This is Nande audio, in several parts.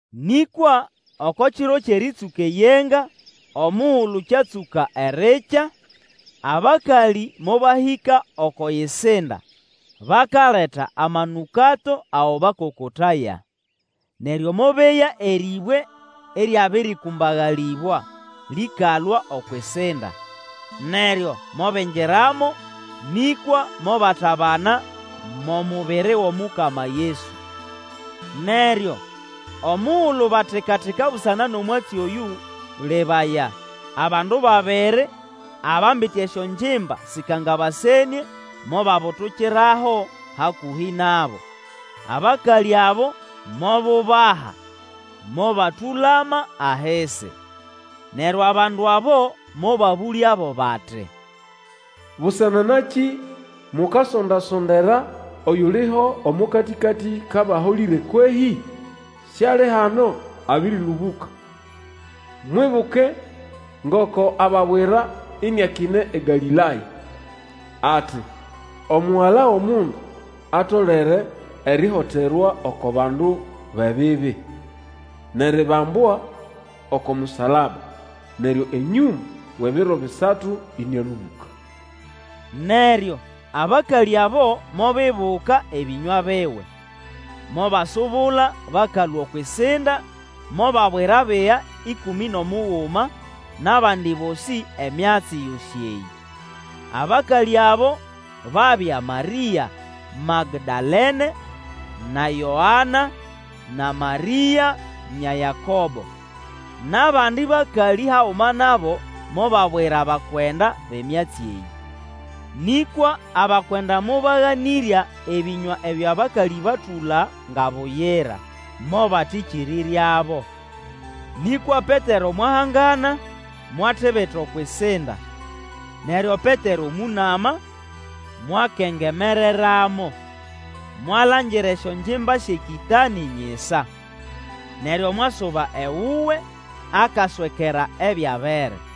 Nĩkwa oko kiro kyʼerĩtsũka eyenga, omugulu kyatsũka erikya, abakalĩ mobahĩka oko yisinda, bakaleta amanũkato ago bakokotaya. Neryo mobeya erĩbwe ĩryabĩrĩkũmbagalĩbwa lĩkalũa okwʼisinda. Neryo mobingiramo, nĩkwa mobatabana mʼomubiri wʼomukama Yesu. Neryo omugulu batika-tika busana nʼomwatsi oyũ, lebuya, abandu babiri abambite esyongimba sĩkangabasenĩe mobabutukiraho hakũhĩ nabo. Abakalĩ abo mobubaha mobatũlama ahisi. Neryo abandu abo mobabũlyabo bati, Busana nakĩ mukasonda-sondera oyuliho omo katĩkatĩ kʼabaholĩre kwehĩ? Siali hano, abĩrĩlũbũka. Mwibuke ngoko ababwira iniakine eGalĩlaya, ati, Omugala, wʼOmundu atolere erihoterwa oko bandu bʼebibi, nʼeribambwa oko musalaba neryo enyũma wʼebiro bisatu ĩnĩalũbũka. Neryo abakalĩ abo mobibuka ebĩnywa biwe, mobasubula bakalũa okwʼisinda, mobabwira abiga ĩkũmĩ nʼomuguma nʼabandi bosĩ emyatsi yosĩ eyĩ. Abakalĩ abo babya Marĩa Magdalene, na Yoana, na Marĩa, nya Yakobo, nʼabandi bakalĩ haguma nabo, mobabwira abakwenda bʼemyatsi eyĩ. Nĩkwa abakwenda mobaganĩrya ebĩnywa ebyo abakalĩ batũla nga buyira, mobatĩkĩrĩryabo. Nĩkwa Petero mwahangana, mwatibita okwʼisinda; neryo Petero mũnama mwakengemereramo, mwalangira esyongimba syʼekĩtanĩ nyisa. Neryo mwasuba ewuwe akaswekera ebyabere.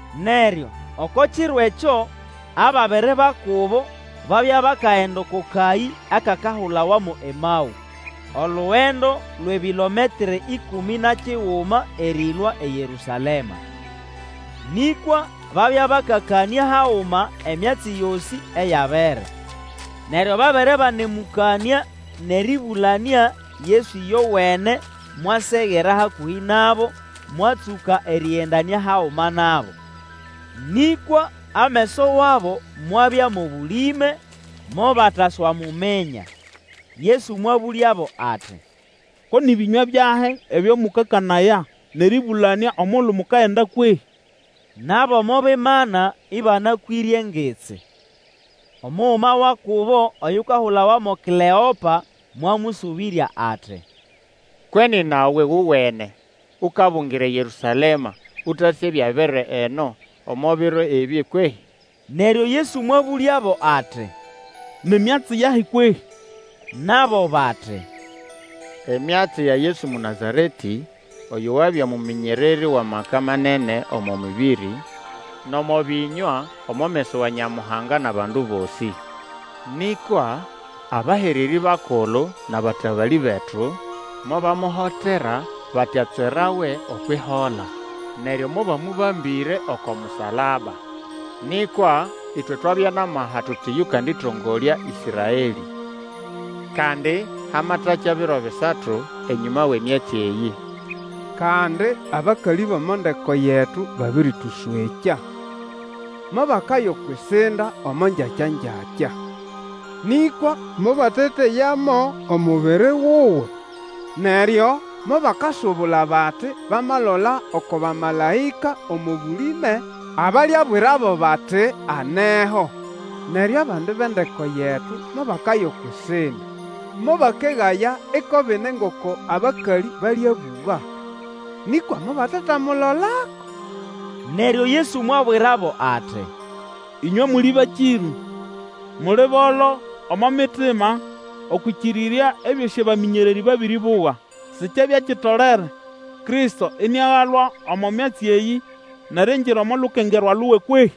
Neryo oko kiro ekyo ababiri ba kubo babya bakagenda oko kayĩ akakahulawa mo Emaũ, olugendo lwʼebilometre ĩkũmĩ na kiguma erĩlũa eYerũsalema. Nĩkwa babya bakakanĩa haguma emyatsi yosĩ eyabere. Neryo babere banemũkanĩa nʼerĩbũlanĩa Yesu ĩyowene mwasegera hakũhĩ nabo mwatsũka erĩgendanĩa haguma nabo. Nĩkwa ameso wabo mwabya omo bũlĩme mobataswamuminya. Yesu mwabũlyabo ati, Ko nĩ bĩnywa byahĩ ebyo mũkakanaya nʼerĩbũlanĩa omugulu mukagenda kwehĩ? Nabo mobimana ĩbanakwĩre engitsi. Omuguma wa kubo oyukahulawa mo Kleopa mwamũsũbĩrya ati, Kwe nina we wowene ukabungira eYerũsalema ũtasĩ ebyabere eno omo biro ebĩ kwehĩ? Neryo Yesu mwabũlyabo ati, Ni myatsi yahi kwehĩ? Nabo bati, Emyatsi ya Yesu Mũnazaretĩ oyo wabya mũmĩnyererĩ wʼamaka manene omo mĩbĩrĩ nʼomo bĩnywa omo meso wa Nyamuhanga nʼabandu bosĩ. Nĩkwa abahererĩ bakulu nʼabatabalĩ betu mobamuhotera bati atswerawe okwʼihola, neryo mobamũbambĩre oko musalaba. Nĩkwa ĩtwe twabya nʼamaha tuti yũkandĩtongolya Ĩsraelĩ. Kandi, hamatakya biro bisatu enyũma wʼemyatsi eyĩ. Kandi abakalĩ bʼomo ndeko yetu babĩrĩtũswekya. Mobakaya okwʼisinda omo ngyakyangyakya. Nĩkwa mobateteyamo omubiri wuwe. Neryo mobakasubula bati bamalola oko bamalaĩka omo bũlĩme abalyabwirabo bati aneho. Neryo abandi bʼendeko yetu mobakaya okwʼisinda mobakegaya iko bine ngoko abakalĩ balĩabũga, nĩkwa mobatetamulolako. Neryo Yesu mwabwirabo ati, Ĩnywe muli bakĩrũ, muli bolo omo mitima okwʼĩkĩrĩrya ebyosĩ abamĩnyererĩ babĩrĩbũga! Sikyabya kitolere Kristo iniagalwa omo myatsi eyĩ nʼeriingira omo lukengerwa luwe kwehi?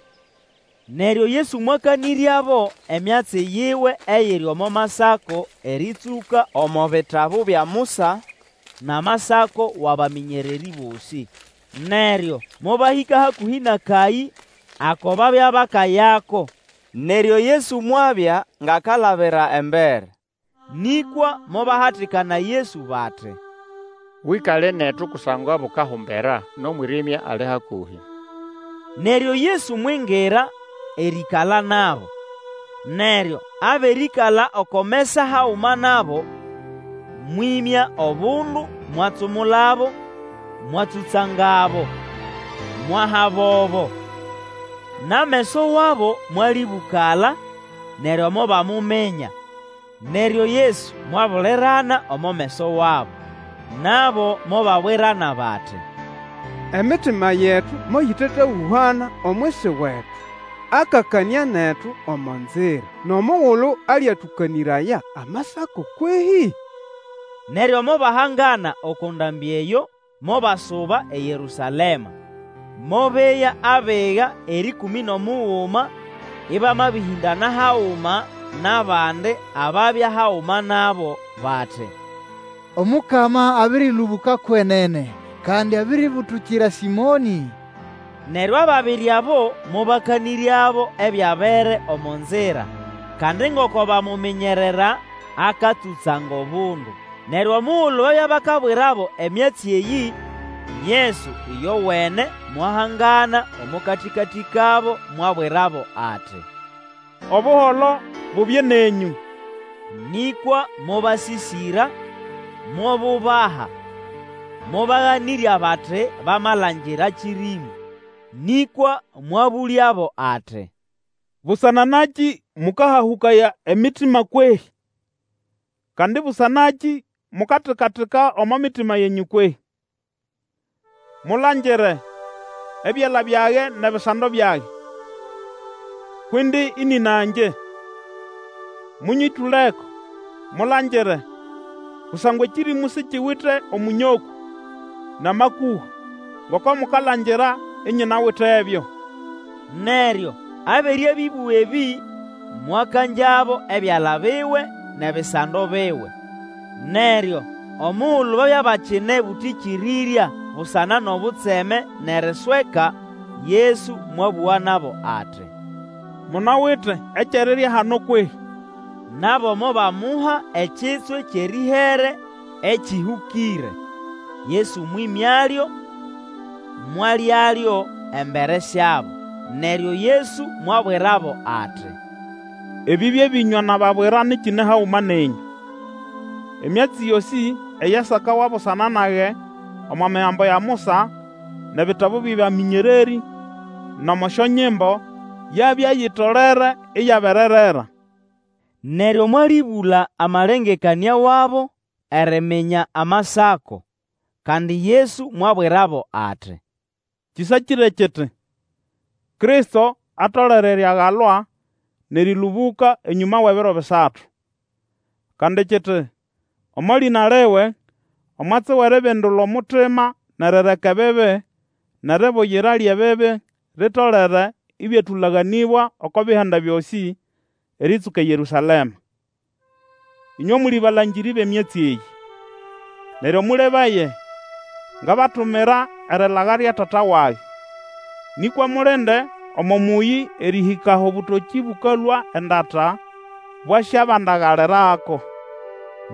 Neryo Yesu mwakanĩryabo emyatsi yiwe eyiri omo Masako erĩtsũka omo bitabu bya Musa nʼamasako wʼabamĩnyererĩ bosĩ. Neryo mobahĩka hakũhĩ nʼakayĩ ako babya bakayako, neryo Yesu mwabya ngʼakalabira embere. Nĩkwa mobahatikana Yesu bati, Wĩkale netu kusangwa bukahumbera, nʼomwĩrĩmya ali hakũhĩ. Neryo Yesu mwingira erĩĩkala nabo. Neryo abere ĩkala oko mesa haguma nabo, mwĩmya obundu mwatsumulabo, mwatsũtsangabo, mwahabobo. Nʼameso wabo mwalĩbũkala neryo mobamuminya, neryo Yesu mwabulirana omo meso wabo. Nabo mobabwirana bati, Emitima yetu moyĩtetahũhana omwisi wetu akakanĩa netu omo nzira, nʼomugulu alyatũkanĩraya Amasako kwehĩ? Neryo mobahangana oko ndambĩ eyo mobasuba eYerũsalema, mobeya abiga erĩkũmĩ nʼomuguma ĩbama bĩhĩndana haguma nʼabandi ababya haguma nabo, bati, Omukama abĩrĩlũbũka kwenene, kandi abiribulukira Sĩmonĩ. Neryo ababiri abo mobakanĩryabo ebyabere omo nzira, kandi ngoko bamuminyerera akatsũtsanga obundu. Neryo omugulu babya bakabwirabo emyatsi eyĩ, Yesu ĩyowene mwahangana omo katĩkatĩ kabo, mwabwirabo ati, Obuholo bubye nenyũ! Nĩkwa mobasĩsĩra, mobubaha, mobaganĩrya bati bamalangira kĩrĩmũ. Nĩkwa mwabũlyabo ati, Busana nakĩ mũkahahũkaya emitima kwehĩ? Kandi busana nakĩ mukatika-tika omo mitima yenyũ kwehĩ? Mulangire ebyala byage nʼebisando byage, kwʼindi ĩnĩna ngye. Mũnyĩtũleko mulangire, kusangwa ekĩrĩmũ sikiwite omũnyokũ nʼamakũha ngoko mukalangira inyinawitebyo. Neryo abere abĩbũga ebĩ, mwakangyabo ebyala biwe nʼebisando biwe. Neryo omugulu babya bakine bũtĩkĩrĩrya busana nʼobutseme nʼerisweka, Yesu mwabũga nabo ati, Munawite ekyʼerirya hano kwehĩ? Nabo mobamuha ekitswe kyʼerĩhere ekĩhũkĩre. Yesu mwĩmyalyo, mwalyalyo embere syabo. Neryo Yesu mwabwirabo ati, Ebĩ bye bĩnywa nababwira nyikine haguma nenyũ; emyatsi yosĩ eyasakawa busana nage omo Migambo ya Musa nʼebitabu byʼabamĩnyererĩ nʼomo Syonyimbo, yabya itolere iyabererera. Neryo mwalĩbũla amalengekanĩa wabo eriminya Amasako. Kandi Yesu mwabwirabo ati, Kĩsakĩre kiti, Kristo atolere eriagalwa nʼerĩlũbũka enyũma wʼebiro bisatu. Kandi kiti, Omo lĩna liwe omwatsi wʼeribindula omutima nʼerireka ebibi, nʼeribuyira lyʼebibi litolere ĩbyatũlaganĩbwa oko bihanda byosĩ, erĩtsũka eYerũsalema. Ĩnywe muli abalangĩrĩ bʼemyatsi eyĩ. Neryo mũlebaye, ngabatumira erilaga lya Tata wage; nĩkwa mulinde omo mũyĩ erĩhĩka aho obũtokĩ bũkalũa endata, bwasyabandagalirako.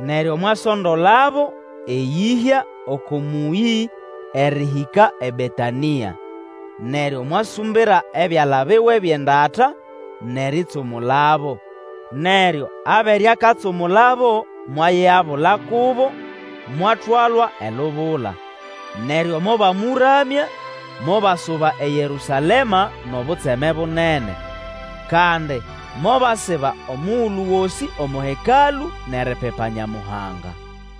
Neryo mwasondolabo eyĩhya oko mũyĩ erĩhĩka eBetanĩa, neryo mwasumbira ebyala biwe byʼendata nʼeritsumulabo. Neryo abere akatsumulabo mwayigabula kubo mwatwalwa elubula. Neryo mobamũramya mobasuba eYerũsalema nʼobutseme bunene. Kandi mobasiba omugulu gosĩ omo Hekalũ nʼeripipa Nyamuhanga.